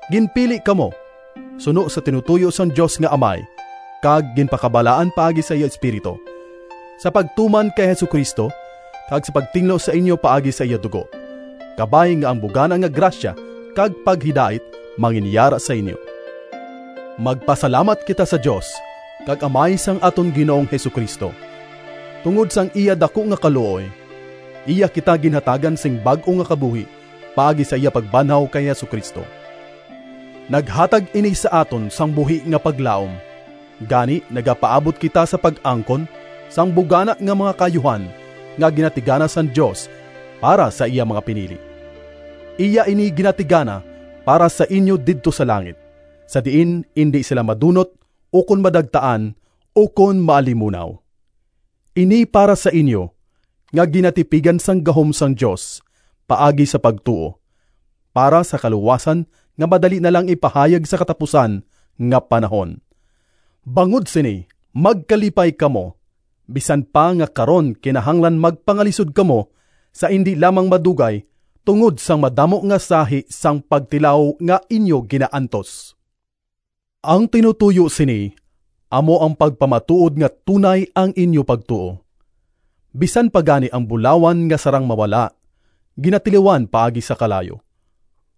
Ginpili kamo suno sa tinutoyo sang Dios nga Amay, kag ginpakabalaan paagi sa iya Espiritu, sa pagtuman kay Jesu-Cristo kag sa pagtinlo sa inyo paagi sa iya dugo. Kabay nga ang bugana nga grasya kag paghidait manginyara sa inyo. Magpasalamat kita sa Dios kag Amay sang aton Ginoong Jesu-Cristo! Tungod sang iya daku nga kaluoy, iya kita ginhatagan sing bag-o nga kabuhi paagi sa iya pagbanhaw kay Jesu-Cristo. Naghatag ini sa aton sang buhi nga paglaom, gani nagapaabot kita sa pag-angkon sang bugana nga mga kaayuhan nga ginatigana sang Dios para sa iya mga pinili. Iya ini ginatigana para sa inyo didto sa langit, sa diin indi sila madunot, ukon madagtaan, ukon maalimunaw. Ini para sa inyo, nga ginatipigan sang gahom sang Dios paagi sa pagtuo, para sa kaluwasan nga madali na lang ipahayag sa katapusan nga panahon. Bangod sini magkalipay kamo, bisan pa nga karon kinahanglan magpangalisod kamo sa indi lamang madugay tungod sang madamo nga sahi sang pagtilaw nga inyo ginaantos. Ang tinutoyo sini amo ang pagpamatuod nga tunay ang inyo pagtuo. Bisan pa gani ang bulawan nga sarang mawala, ginatilawan paagi sa kalayo.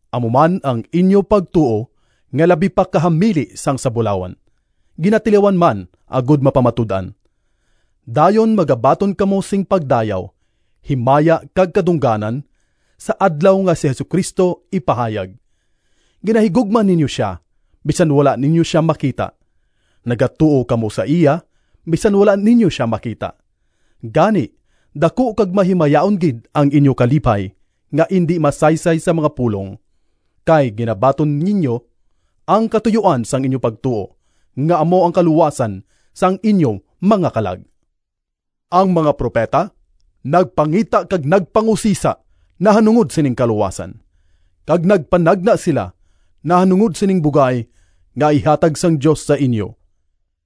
Amo man ang inyo pagtuo nga labi pa ka hamili sang sa bulawan, ginatilawan man agod mapamatud-an. Dayon magabaton kamo sing pagdayaw, himaya kag kadungganan sa Adlaw nga si Jesu-Cristo ipahayag. Ginahigugma ninyo sia, bisan wala ninyo sia makita. Nagatuo kamo sa iya, bisan wala ninyo sia makita. Gani daku kag mahimayaon gid ang inyo kalipay nga indi masaysay sa mga pulong, kay ginabaton ninyo ang katuyoan sang inyo pagtuo, nga amo ang kaluwasan sang inyo mga kalag. Ang mga propeta nagpangita kag nagpangusisa nahanungod sining kaluwasan, kag nagpanagna sila nahanungod sining bugay nga ihatag sang Dios sa inyo.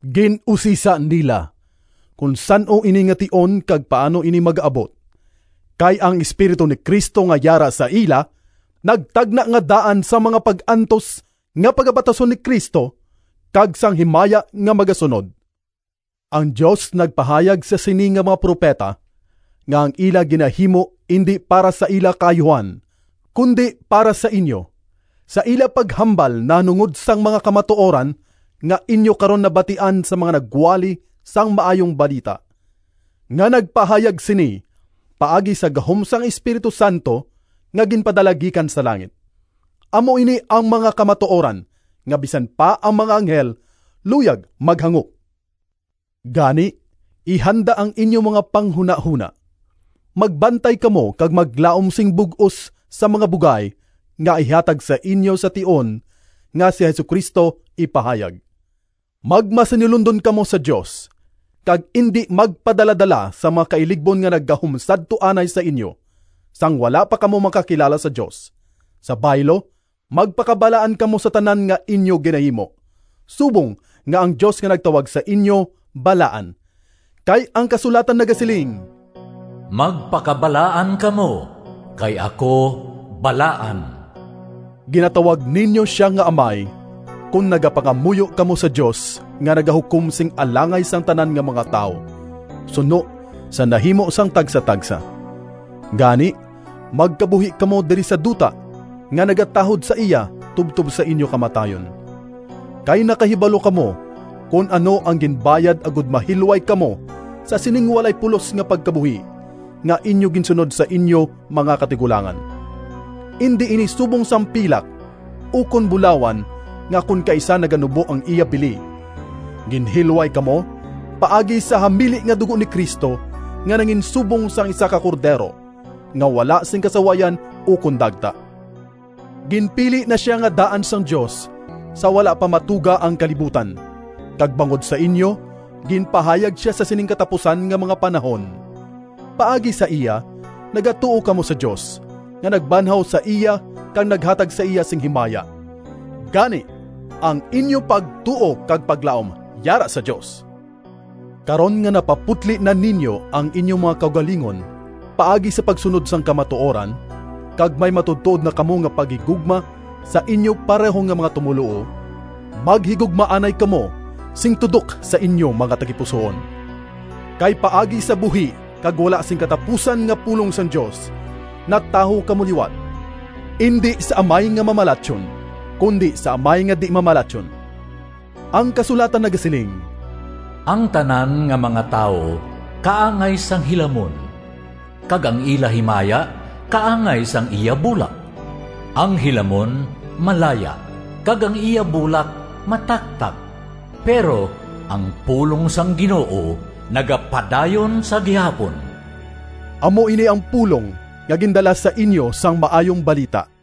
Gin-usisa nila kon san-o ini nga tion kag paano ini magaabot. Kay ang Espiritu ni Cristo nga yara sa ila nagtagna nga daan sang mga pag-antos nga pagabatason ni Cristo, kag sang himaya nga magasunod. Ang Dios nagpahayag sa sini nga mga propeta nga ang ila ginahimo indi para sa ila kaayuhan, kundi para sa inyo, sa ila paghambal nahanungod sang mga kamatuoran nga inyo karon nabatian sa mga nagwali sang Maayong Balita, nga nagpahayag sini paagi sa gahom sang Espiritu Santo nga ginpadala gikan sa langit. Amo ini ang mga kamatuoran nga bisan pa ang mga anghel luyag maghangop. Gani, ihanda ang inyo mga panghunahona. Magbantay kamo kag maglaom sing bug-os sa mga bugay nga ihatag sa inyo sa tion nga si Jesu-Cristo ipahayag. Magmasinulondon kamo sa Dios, kag indi magpadaladala sa mga kailigbon nga naggahom sadto anay sa inyo, sang wala pa kamo makakilala sa Dios. Sa baylo, magpakabalaan kamo sa tanan nga inyo ginahimo, subong nga ang Dios nga nagtawag sa inyo, balaan. Kay ang kasulatan nagasiling, “Magpakabalaan kamo, kay ako balaan.” Ginatawag ninyo sia nga Amay, kon nagapangamuyo kamo sa Dios nga nagahukom sing alangay sang tanan nga mga tawo, suno sa nahimo sang tagsatagsa. Gani, magkabuhi kamo diri sa duta nga nagatahod sa iya tubtob sa inyo kamatayon. Kay nakahibalo kamo kon ano ang ginbayad agod mahilway kamo sa sining walay pulos nga pagkabuhi nga inyo ginsunod sa inyo mga katigulangan. Indi ini subong sang pilak ukon bulawan nga kon kaisa naganubo ang iya bili. Ginhilway kamo paagi sa hamili nga dugo ni Cristo, nga nanginsubong sang isa ka cordero nga wala sing kasawayan ukon dagta. Ginpili na sia nga daan sang Dios sa wala pa matuga ang kalibutan, kag bangod sa inyo ginpahayag sia sa sining katapusan nga mga panahon. Paagi sa iya nagatuo kamo sa Dios, nga nagbanhaw sa iya kag naghatag sa iya sing himaya. Gani, ang inyo pagtuo kag paglaom yara sa Dios. Karon nga napaputli na ninyo ang inyo mga kaugalingon paagi sa pagsunod sang kamatuoran, kag may matuodtuod na kamo nga paghigugma sa inyo pareho nga mga tumoluo, maghigugmaanay kamo sing tudok sa inyo mga tagipusoon. Kay paagi sa buhi kag wala sing katapusan nga pulong sang Dios natawo kamo liwat, indi sa amay nga mamalatyon, kundi sa amay nga di-mamalatyon. Ang kasulatan nagasiling: “Ang tanan nga mga tawo Kaangay sang hilamon, Kag ang ila himaya Kaangay sang iya bulak. Ang hilamon malaya, Kag ang iya bulak mataktak, Pero ang pulong sang Ginoo Nagapadayon sa gihapon.” Amo ini ang pulong nga gindala sa inyo sang Maayong Balita.